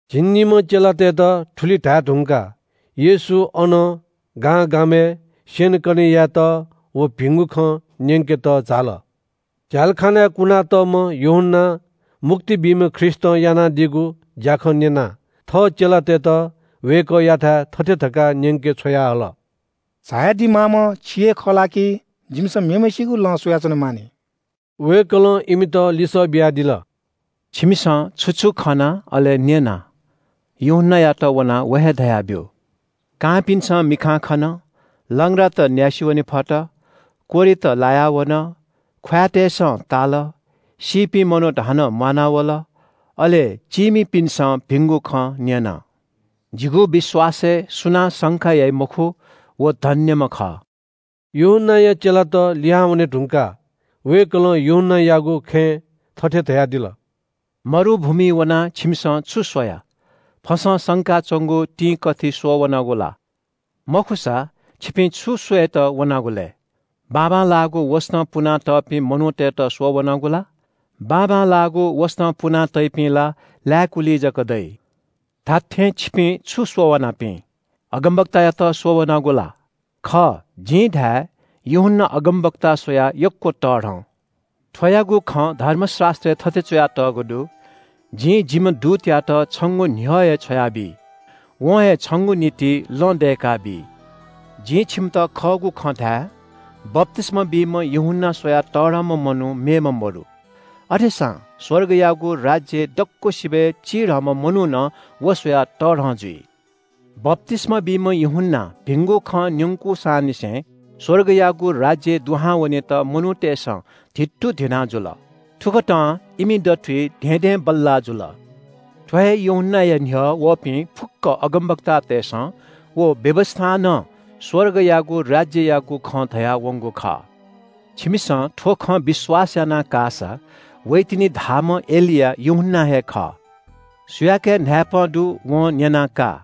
झिंनिम्‍ह चेलातय्‌त थुलि धाये धुंकाः येशू अनं गांगामय् स्‍यनेकने यायेत व भिंगु खँ न्‍यंकेत झाल। झ्‍यालखानाय् कुनातःम्‍ह यूहन्‍नां मुक्ति बीम्‍ह ख्रीष्‍टं यानादीगु ज्‍याखँ न्‍यनाः थः चेलातय्‌त वय्‌कःयाथाय् थथे धकाः न्‍यंके छ्वयाहल। “झायादी माःम्‍ह छि हे खः ला कि जिमिसं मेम्‍हय्‌सिगु लँ स्‍वयाच्‍वनेमाः नि?” वय्‌कलं इमित लिसः बियादिल – “छिमिसं छु छु खना अले न्‍यना यूहन्‍नायात वनाः व हे धयाब्‍यु। कांपिन्‍सं मिखां खन, लंग्रात न्‍यासि वने फत, कोह्रित लाया वन, ख्‍वाँय्‌तय्‌सं ताल, सीपिं मनूत हानं म्‍वानावल, अले चीमिपिन्‍सं भिंगु खँ न्‍यन। जिगु विश्‍वासय् सुनां शंका याइ मखु, व धन्‍यम्‍ह खः।” यूहन्‍नाया चेलात लिहां वने धुंकाः वय्‌कलं यूहन्‍नायागु खँय् थथे धयादिल – “मरुभूमिइ वनाः छिमिसं छु स्‍वया? फसं संका च्‍वंगु तिंकथि स्‍वःवनागु ला? मखुसा छिपिं छु स्‍वयेत वनागु लय्? बाबांलाःगु वसतं पुनातःपिं मनूतय्‌त स्‍वःवनागु ला? बाबांलाःगु वसतं पुना तइपिं ला लाय्‌कुलिइ जक दइ। धात्‍थें छिपिं छु स्‍वः वनापिं? अगमवक्तायात स्‍वःवनागु ला? खः, जिं धाये – यूहन्‍ना अगमवक्ता स्‍वयाः यक्‍व तःधं। थ्‍वयागु खँ धर्मशास्‍त्रय् थथे च्‍वयातःगु दु – “‘जिं जिम्‍ह दूतयात छंगु न्‍ह्यः हे छ्वयाबी। वं हे छंगु निंतिं लँ दय्‌काबी।’” “जिं छिमित खःगु खँ धाये – बप्‍तिस्‍मा बीम्‍ह यूहन्‍ना स्‍वयाः तःधंम्‍ह मनू मेम्‍ह मदु। अथेसां स्‍वर्गयागु राज्‍यय् दक्‍वसिबय् चिधंम्‍ह मनू नं व स्‍वयाः तःधं जुइ। बप्‍तिस्‍मा बीम्‍ह यूहन्‍नां भिंगु खँ न्‍यंकूसांनिसें स्‍वर्गयागु राज्‍यय् दुहां वनेत मनूतय्‌सं धित्तुधिनाः जुल। थुकथं इमि दथुइ धेंधेंबल्‍लाः जुल। थ्‍व हे यूहन्‍नाया न्‍ह्यः वःपिं फुक्‍क अगमवक्तातय्‌सं व व्‍यवस्‍थां नं स्‍वर्गयागु राज्‍ययागु खँ धयावंगु खः। छिमिसं थ्‍व खँ विश्‍वास याना काःसा वइतिनि धाःम्‍ह एलिया यूहन्‍ना हे खः। सुयाके न्‍हाय्‌पं दु वं न्‍यना का।”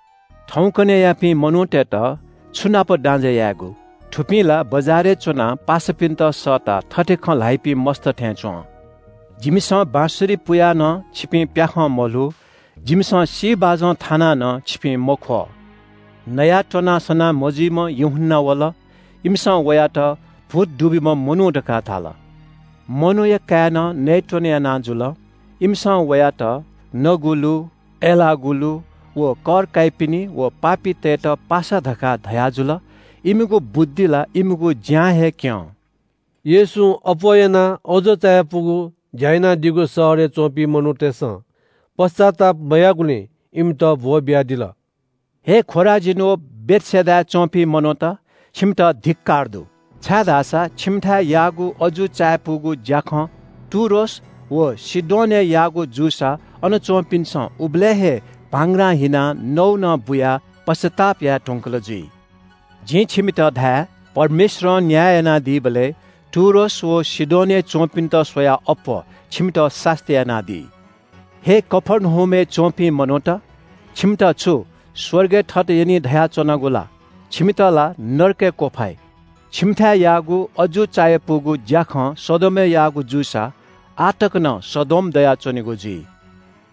“थौंकन्‍हय्‌यापिं मनूतय्‌त छु नाप दाँजय् यायेगु? थुपिं ला बजारय् च्‍वनाः पासापिन्‍त सःताः थथे खँ ल्‍हाइपिं मस्‍त थें च्‍वं – “‘जिमिसं बाँसुरी पुयाः नं छिपिं प्‍याखं मल्‍हू, जिमिसं सी बाजं थानाः नं छिपिं मख्‍वः।’ “नयाःत्‍वनाः सनामजुइम्‍ह यूहन्‍ना वल। इमिसं वयात – ‘भूत दुब्‍यूम्‍ह मनू’ धकाः धाल। मनूया काय्‌नं नयेत्‍वने याना जुल। इमिसं वयात – ‘नगुलु, अय्‌लाःगुलुत व कर काइपिनि व पापीतय् पासा’ धकाः धयाजुल। इमिगु बुद्धि ला इमिगु ज्‍यां हे क्‍यं।” येशूं अप्‍वः यानाः अजू चायापुगु ज्‍या यानादीगु शहरय् च्‍वंपिं मनूतय्‌सं पश्‍चाताप मयाःगुलिं इमित ब्‍वःबियादिल। “हे खोराजीन व बेथसेदाय् च्‍वंपिं मनूत, छिमित धिक्‍कार दु, छाय्‌धाःसा छिमिथाय् याःगु अजू चायापुगु ज्‍याखँ टुरोस व सीदोनय् याःगु जूसा अन च्‍वंपिन्‍सं उबलय् हे भांग्रां हिनाः नौनं बुयाः पश्‍चाताप याये धुंकल जुइ। जिं छिमित धाये – परमेश्‍वरं न्‍याय यानादीबलय् टुरोस व सीदोनय् च्‍वंपिन्‍त स्‍वयाः अप्‍वः छिमित सास्‍ती यानादी। “हे कफर्नहुमय् च्‍वंपिं मनूत, छिमित छु स्‍वर्गय् थत यनी धयाच्‍वनागु ला? छिमित ला नरकय् क्‍वफाइ। छिमिथाय् याःगु अजू चायापुगु ज्‍याखँ सदोमय् याःगु जूसा आः तक नं सदोम दयाच्‍वनीगु जुइ।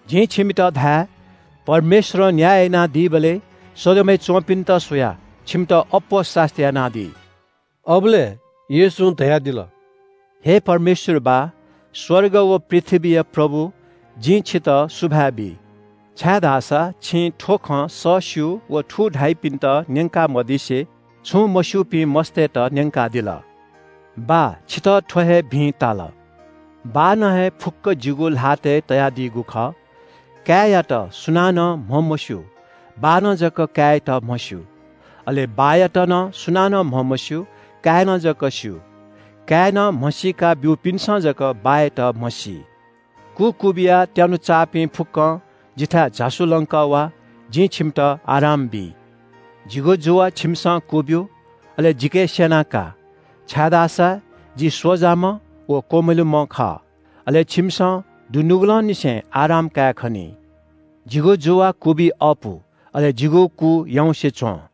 जिं छिमित धाये – परमेश्‍वरं न्‍याय यानादीबलय् सदोमय् च्‍वंपिन्‍त स्‍वयाः छिमित अप्‍वः सास्‍ती यानादी।” अबलय् येशूं धयादिल – “हे परमेश्‍वर बाः, स्‍वर्ग व पृथ्‍वीया प्रभु, जिं छितः सुभाय् बी, छाय्‌धाःसा छिं थ्‍व खँ सःस्‍यू व थू धाइपिन्‍त न्‍यंका मदिसे छुं मस्‍यूपिं मस्‍तय्‌त न्‍यंकादिल। बाः छितः थ्‍व हे भिं ताल।” “बाःनं हे फुक्‍क जिगु ल्‍हातय् तयादीगु खः। काय्‌यात सुनानं म्‍हमस्‍यू, बाःनं जक काय्‌यात म्‍हस्‍यू। अले बाःयात नं सुनानं म्‍हमस्‍यू, काय्‌नं जक स्‍यू। काय्‌नं म्‍हसीका ब्‍यूपिन्‍सं जक बाःयात म्‍हसी।” “कु क्‍वबिया त्‍यानुचाःपिं फुक्‍कं जिथाय् झासु लंकः वा, जिं छिमित आराम बी। जिगु जुवा छिमिसं क्‍वब्‍यु, अले जिके स्‍यना का, छाय्‌धाःसा जि स्‍वजाम्‍ह व क्‍वमिलुम्‍ह खः। अले छिमिसं दुनुगलंनिसें आराम कायेखनी। जिगु जुवा क्‍वबी अःपु, अले जिगु कु याउँसे च्‍वं।”